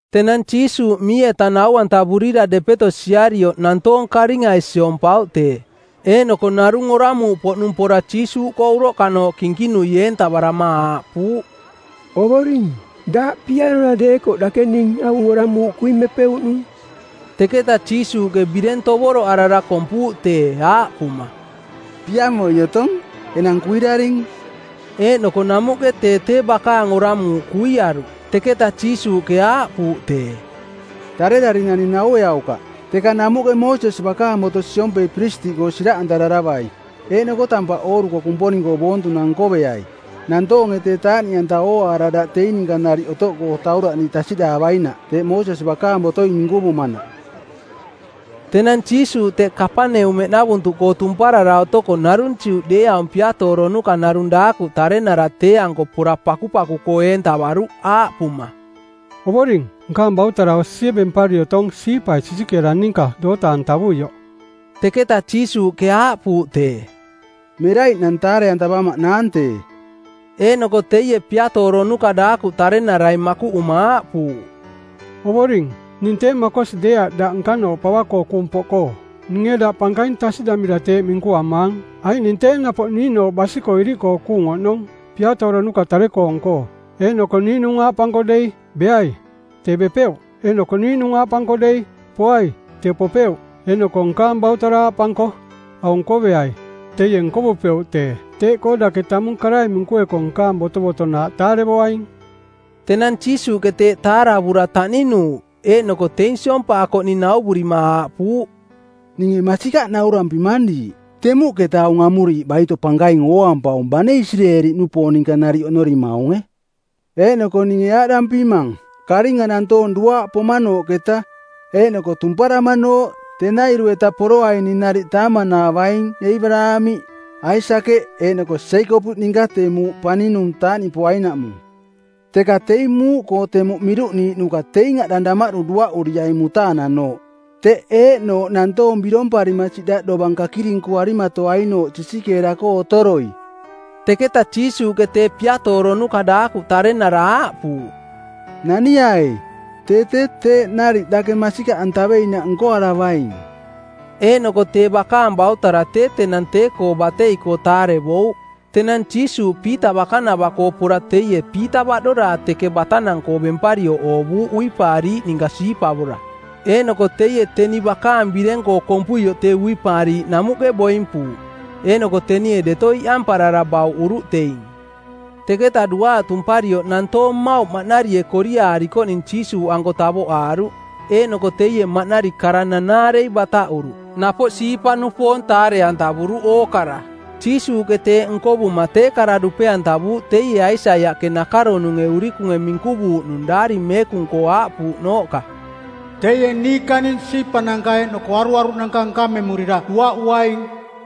Tenang Jiisuuꞌ mii-eta nau-antavurira depeto siarioꞌ nantoong karingai siompauꞌ tee. Eeꞌnoko narung oramuuꞌpoꞌnung pora Jiisuuꞌkoo uroꞌkanooꞌ kinkinui eentavarama aaꞌpuuꞌ, “Ovoring, daꞌ piarora deekoꞌ dake ning aung oramuuꞌ kuimepeuꞌnung.” Teketa Jiisuuꞌke bireng tovoroꞌarara kompuuꞌ tee, aaꞌpuma, “Piamoi otong. Enang kuiraring!” Eeꞌnoko namuꞌke tee tee bakaang oramuuꞌ kuiaruꞌ. Teketa Jiisuuꞌke aaꞌpuuꞌ tee, “Tarerari naning naueaukaꞌ, teka namuꞌke Moosesi bakaang boto siompei piristiꞌkoo siraꞌantararavai, eeꞌnoko tampaꞌ ooruko Kumponing-koo boontunang nkoveai nantoonge tee taaꞌniꞌanta ooaara daꞌ teing ninka nariꞌ otoꞌkoo tauraꞌniiꞌ tasiꞌdaavainaꞌ, teeꞌ Moosesi bakaang botoi minkuvumanaꞌ.” Tenang Jiisuuꞌ teꞌ Kapaneumeꞌnavuntuꞌkoo tumparara otoko narung Juꞌdeeaung piatooronuka narung daakuꞌ tarenara tee-anko pora pakupaku-koo eentavaruꞌ aaꞌpuma, “Ovoring, nkaang bautara osie bempari otong siipai sisikeera ninka doota-antavuioꞌ.” Teketa Jiisuuꞌke aaꞌpuuꞌ tee, “Meraiꞌnang taare-antavamaꞌnaang tee.” Eeꞌnoko teie piatooronuka daakuꞌ tarenarai makuꞌuma aaꞌpuuꞌ, “Ovoring, ning tee makosi deeaꞌ daꞌ nkanooꞌ pava-koo kuung poꞌkoo; Ninge daꞌ pankaing tasiꞌdamira teeꞌ minkuamaang, aiꞌ ning tee napoꞌ niiꞌnooꞌ basi-koo iriꞌkoo kuung oꞌnong piatooronuka tare-koong-koo. Eeꞌnoko niiꞌnung aaꞌpanko dei, ‘Beai,’ tee bepeuꞌ. Eeꞌnoko niiꞌnung aaꞌpanko dei, ‘Poai,’ tee popeuꞌ. Eeꞌnoko nkaang bautara aaꞌpanko, ‘Aung nkoveai,’ teie nkovupeuꞌ tee. Teeꞌkoo dake tamung karai minkueko nkaang botovotonaaꞌ taarevoaing.” Tenang Jiisuuꞌke teeꞌ taaravura taꞌninuuꞌ, eeꞌnoko teing siompaakoꞌning nauvurima aaꞌpuuꞌ, “Ninge masikaꞌ naurampimang diiꞌ: Temuꞌketa aung amuriiꞌ baito pankaing ooampaung bane Isireeli-nupoong ninka nariꞌ oꞌnorimaunge. Eeꞌnoko ninge aaꞌdampimang, karinga nantoong duaaꞌ pomanooꞌketa eeꞌnoko tumparamanooꞌ tenairu-eta poroaining nariꞌ taaman-aavaing Eebaraamiꞌ, Aisakeꞌ eeꞌnoko Jeekopiꞌ ninka tee muuꞌ paninung taaꞌniꞌpoainaꞌmung. Teka teing muuꞌkoo temuꞌ miruꞌniiꞌnuka teing aꞌdang damaꞌdu duaꞌuriaining mutaananooꞌ, teꞌ eeꞌnooꞌ nantoong biromparima siꞌdaꞌ dovang kakirinkuarimatoainooꞌ sisikeera-koo otoroi.” Teketa Jiisuuꞌke tee piatooronuka daakuꞌ tarenara aaꞌpuuꞌ, “Naniai. Tee tee teeꞌ nariꞌ dake masikaꞌantaveinaꞌ nkoaravaing.” Eeꞌnoko tee bakaang bautara tee tenang tee-koo batei-koo taarevouꞌ. Tenang Jiisuuꞌ Piita bakanava-koo pora teie Piita baꞌdoraa teke batanang-koo bemparioꞌ oovuuꞌ uipaariiꞌ ninka siipavora. Eeꞌnoko teie teni bakaang bireng-koo kompuioꞌ tee uipaariiꞌ namuꞌke boimpuuꞌ, eeꞌnoko tenie deto iꞌamparara bauꞌuruꞌ teing. Teketa duaaꞌ tumparioꞌ nantoong mmauꞌ maꞌnarie koriaarikoꞌning Jiisuuꞌanko tavoꞌaaruꞌ, eeꞌnoko teie maꞌnari kara nanaarei bataꞌuruꞌ, napoꞌ siipa-nupoong taare-antavuruꞌ ookara. Jiisuuꞌke teeꞌ nkovuma tee kara dupe-antavuuꞌ teie Aisaiaꞌke nakaronunge urikunge minkuvuuꞌnung Daari Meekung-koo aaꞌpuuꞌnooꞌka, “Teie niikaning siipananka eeꞌnoko aruaruꞌnanka nkamemurira duaꞌuaing.”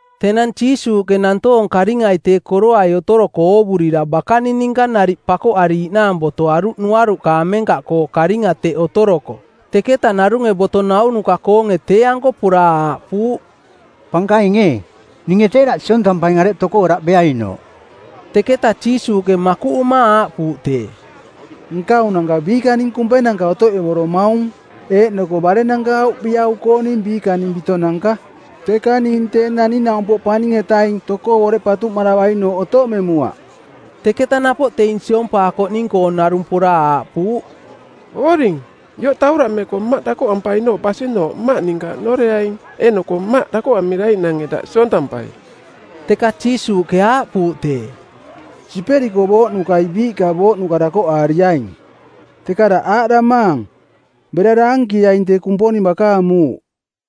Tenang Jiisuuꞌke nantoong karingai tee koroai otoroko oovurira bakaning ninka nariꞌ pakoꞌariiꞌnaang botoaruꞌ nuaruꞌka amenkaꞌkoo karinga teꞌ otoroko. Teketa narunge boto naunuka-koonge tee-anko pora aaꞌpuuꞌ, “Pankaing ee, ninge tee daꞌ siontampaing areꞌ tokoo daꞌ beainooꞌ.” Teketa Jiisuuꞌke makuꞌuma aaꞌpuuꞌ tee, “Nkaunanka biikaning kumpenanka otoꞌevoromaung, eeꞌnoko barennanka auviꞌau-kooning biikaning bitonanka, teka ning Tee Naning-naumpoꞌ Paning-etaing˜ tokoo boreꞌ patuꞌmaravainooꞌ otoꞌmemuaꞌ.” Teketa napoꞌ teing siompaakoꞌning-koong narung pora aaꞌpuuꞌ, “Ovoring, ioꞌ tauraꞌmeko mmaꞌ dakoꞌampainooꞌ basinooꞌ mmaꞌ ninka oꞌnoreaing, eeꞌnoko mmaꞌ dakoꞌamiraiꞌnange daꞌ siontampai.” Teka Jiisuuꞌke aaꞌpuuꞌ tee, “Siperiko booꞌnukai biiꞌka booꞌnuka dakoꞌaariaing, teka daꞌ aaꞌdamaang: Bera daankieaing tee Kumponing bakaang muuꞌ.”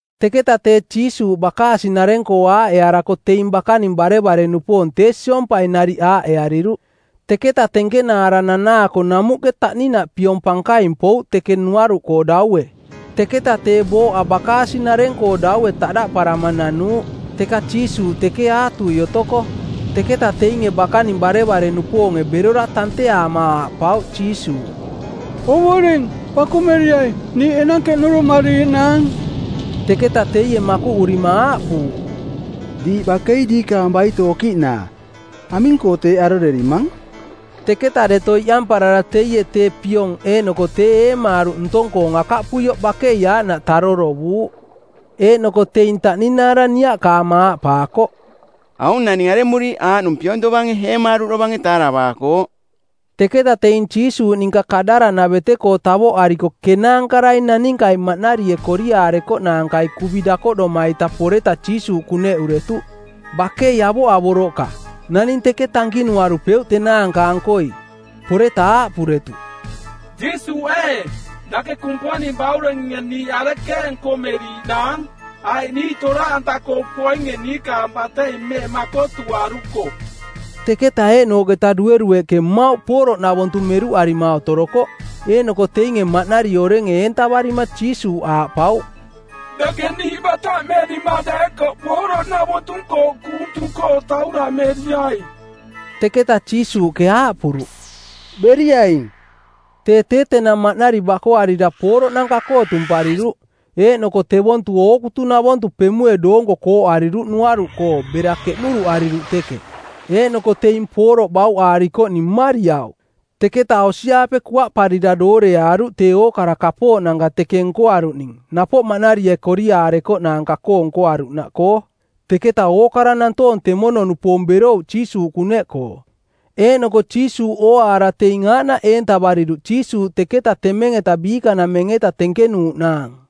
Teketa tee Jiisuuꞌ bakaasi-nareng-koo aaꞌearako teing bakaning barevare-nupoong tee siompai nariꞌ aaꞌeariruꞌ. Teketa tenkenaara nanaako namuꞌke taꞌninaꞌ piong pankaing pouꞌ teke nuaruꞌkoo daue. Teketa tee booꞌa bakaasi-nareng-koo daue taꞌdaꞌparama nanuuꞌ, teka Jiisuuꞌ teke aatui otoko. Teketa teinge bakaning barevare-nupoonge berora tanteaama aaꞌpauꞌ Jiisuuꞌ, “Ovoring, pakumeriai, niiꞌ enang keꞌnuruꞌmariiꞌnaang!” Teketa teie makuꞌurima aaꞌpuuꞌ, “Diiꞌ bakei diikaang baito okiꞌnaa. Aming-koo teeꞌ arorerimang?” Teketa deto iꞌamparara teie tee piong eeꞌnoko tee eemaaruꞌ ntong-koong akaꞌpuioꞌ bakei aaꞌnaꞌ tarorovuuꞌ. Eeꞌnoko teing taꞌninaara niaꞌkaama aaꞌpaakoꞌ, “Aung naning aremuriiꞌ aaꞌnung piong tovange eemaaruꞌ dovange taaravaakooꞌ?” Teketa teing Jiisuuꞌninka Kadaraꞌnavete-koo tavoꞌariko kenaankarai naninkai maꞌnarie koriaarekoꞌnaankai kuvi dakoꞌdoma-ita poreta Jiisuuꞌ kuneꞌuretuꞌ. Bakei avoꞌavoroꞌka. Naning teke tankinuarupeuꞌ tenaanka-ankoi. Poreta aaꞌpuretuꞌ, “Jiisuuꞌ ee, dake Kumponing Bauringe niiꞌ arekeeꞌ nkomeriiꞌnaang? Aiꞌ niiꞌ toraꞌanta-koo poinge niikaang batei mmeꞌ makotuaruko?” Teketa eeꞌnooꞌketa duerueꞌke mmauꞌ pooroꞌnavontu meruꞌarima otorokoꞌ. Eeꞌnoko teinge maꞌnari orenge eentavarima Jiisuuꞌ aaꞌpauꞌ, “Dake bataꞌmerima deekoꞌ pooroꞌnavontu-koo kuung tung-koo tauraꞌmeriai.” Teketa Jiisuuꞌke aaꞌpuruꞌ, “Beriaing.” Tee tee tenang maꞌnari bakoarira pooroꞌnanka-koo tumpariruꞌ, eeꞌnoko tevontu ootukunavontu pemue doonko kooꞌariruꞌ nuaruꞌkoo bera keꞌnuruꞌariruꞌ teke. Eeꞌnoko teing pooroꞌ bauꞌaarikoꞌning mmariauꞌ. Teketa osi-aape kuaꞌparira dooreaaruꞌ tee ookara kapooꞌnanka teke nkoaruꞌning napoꞌ maꞌnarie koriaarekoꞌnaanka-koo nkoaruꞌnaꞌkoo. Teketa ookara nantoong temono-nupoong berouꞌ Jiisuuꞌ kuneꞌkoo, eeꞌnoko Jiisuuꞌ ooaara teing aaꞌnaꞌ eentavariruꞌ Jiisuuꞌ teketa temeng-eta biikanameng-eta tenkenuuꞌnaang.